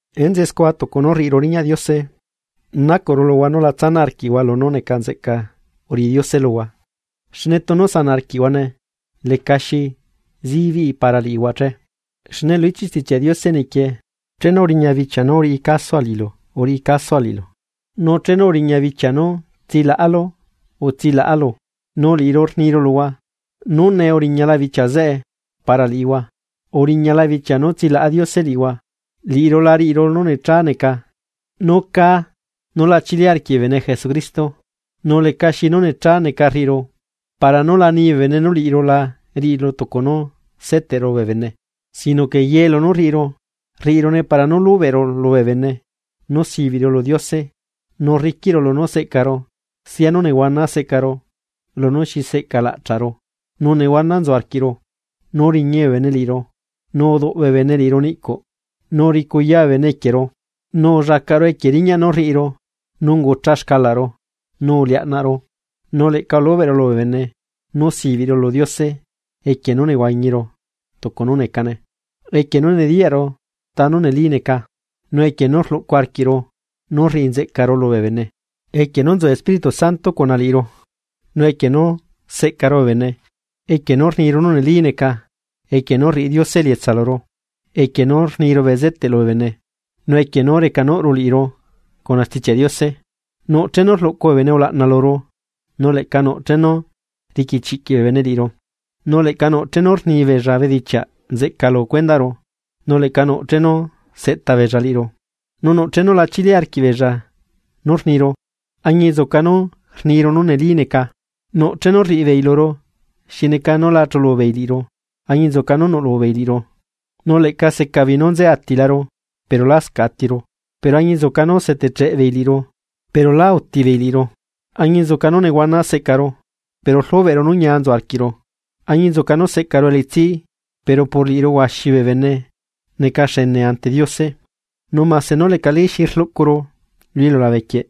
Enzeꞌe scua tucu nú rriꞌiru riñaꞌ Diose, nacuꞌru luhua nú la tsanaꞌ arquiꞌhua lunú neca nzeꞌca uriꞌi Diose luhua, xne tunu sanaꞌ arquiꞌhuane lecaxi zibiꞌi para liꞌihua che. Xne lu ichiꞌ Stichiaꞌ Diose nequie: Chenu uriña bichia nú uriꞌi casua liꞌilu, uriꞌi casua liꞌilu; nu chenu uriña bichia nú tsilaꞌalu utsilaꞌalu. Nu liꞌiru rniru luhua nú nee uriñala bichia zeꞌe para liꞌihua, uriñala bichia nú tsilaꞌa Diose liꞌihua. Liꞌiru la riꞌiru nú necha neca nú caa nú la chili arquiꞌ bee bene Jesucristo, nu lecaxi nú necha neca rriꞌiru para nú la nibee bene nú liꞌiru la riꞌiru tucu nú seteꞌru bee bene. Sino que ye lunú rriꞌiru, rriꞌirune para nú lubeꞌru lubee bene nú sibiꞌru lu Diose nu rriquiꞌru lunú seꞌcaru sia nú nehuana seꞌcaru, lunú xi seꞌcalaꞌchaꞌru, nu nehuana nzu arquiꞌru, nu riñi bee bene liꞌiru. Nu uduꞌ bee bene liꞌiru niꞌcuꞌ, nu uricuyaa bee bene equieru, nu ullacaꞌru equie riñaꞌ nú rriꞌiru nu ungucha xcalaꞌru, nu uliaꞌnaꞌru. Nu leꞌca ulubeꞌru lubee bene nú sibiꞌru lu Diose equie nú nehuañiru tucu nú necane, equie nú nediyaꞌru tanú neli neca, nu equie nú rluꞌcu arquiꞌru nu rriꞌi nzeꞌcaru lubee bene, equie nú nzu Espíritu Santo cuna liꞌiru, nu equie nú seꞌcaru bee bene, equie nú rniru nú neli neca, equie nú rriꞌi Diose elietsa luru, equie nú rniru bezeteꞌ lubee bene, nu equie nú recanuꞌru liꞌiru cuna Stichiaꞌ Diose. Nuꞌ chenu rluꞌcu bee bene ulaꞌna luru nu leꞌca nuꞌ chenu riqui chiꞌquiꞌ bee bene liꞌiru. Nu leꞌca nuꞌ chenu rni beella bedichiaꞌ nzeꞌca lu cuendaꞌru, nu leꞌca nuꞌ chenu seꞌta beella liꞌiru. Nu nuꞌ chenu la chili arquiꞌ beella nú rniru, añinzuca nú rniru nú neli neca. Nuꞌ chenu rriꞌibeei luru xi neca nú la chulu beei liꞌiru, añinzuca nú nuꞌlubeei liꞌiru. Nu leꞌca seca beei nú nze atilaru, pero lascaꞌ atiru, pero añinzuca nú uzeteꞌcheꞌbeei liꞌiru pero lá utibeei liꞌiru. Añinzuca nú nehuana seꞌcaru, pero rlubeꞌru nú ñia nzu arquiꞌru, añinzuca nú seꞌcaru elitsi pero por liꞌiru huaxi bee bene neca xene ante Diose, nu mase nú lecali xi rluꞌcuru lu iliulabe quieꞌ,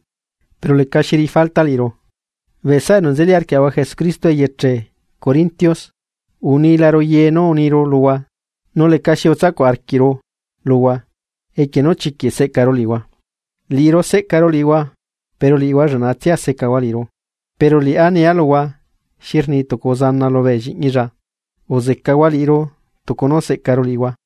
pero lecaxi riꞌi falta liꞌiru. Bee saꞌa enu nzeli arquiaꞌahua Jesucristo eyeche corintios, unilaru ye nú uniru luhua nu lecaxi utsacuꞌ arquiꞌru luhua equie nú chiquiꞌ seꞌcaru liꞌihua. Liꞌiru seꞌcaru liꞌihua, pero liꞌihua lleꞌnatsia secahua liꞌiru. Pero liꞌá nia luhua xi rni tucu uzana lubee lliꞌñilla: Uzecahua liꞌiru tucu nú seꞌcaru liꞌihua.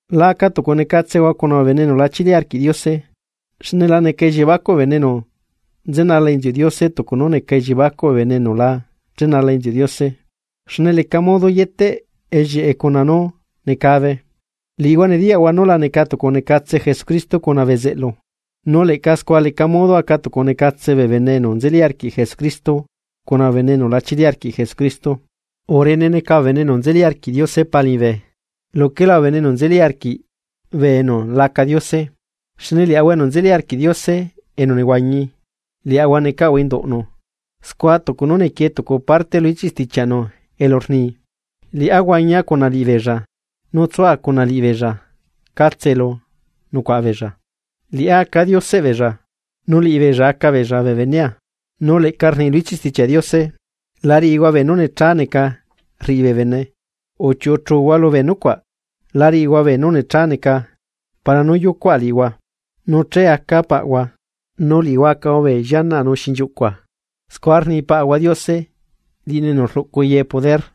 La aca tucunecatsehua cuna bee bene enu la chili arquiꞌ Diose, xne la neca elliebacuꞌ bee bene enu nzenala inziuꞌ Diose tucu nú neca elliebacuꞌ bee bene enu la chenala inziuꞌ Diose. Xne leca modo yeteꞌ ellieꞌe cuna nú necabe. Liꞌihua nediyaꞌhua nu la neca tucunecatse Jesucristo cuna bezeꞌlu, nu leꞌca scua leca modo aca tucu necatse bee bene enu nzeli arquiꞌ Jesucristo cuna bee bene enu la chili arquiꞌ Jesucristo. Urene neca bee bene enu nzeli arquiꞌ Diose Pa liñibe luquela bee bene enu nzeli arquiꞌ bee enu laca diose, xne liaꞌahua enu nzeli arquiꞌ Diose enu nehuañi, liaꞌahua necaꞌahua induꞌnu, scua tucu nú nequie tucu parte lu ichiꞌ stichiaꞌnu elu rni: Liꞌá huañia cuna liꞌibeella nu tsua cuna liꞌibeella catse elu nucuaꞌa beella. Liꞌá aca Dioseꞌ beella, nu liꞌibeella aca beella bee benea. Nu leꞌca rni lu ichiꞌ Stichiaꞌ Diose: La riꞌihua beenú necha neca rriꞌi bee bene, uchiuꞌu chuhua lubee nucuaꞌ. La riꞌihua beenú necha neca. Para nú yucuaꞌa liꞌihua, Nu che acaa Paꞌhua, nu liꞌihua acahua bee llianaꞌa nu xinchiuꞌcua, scua rni Paꞌahua Diose, liꞌinu enu rluꞌcu ye poder.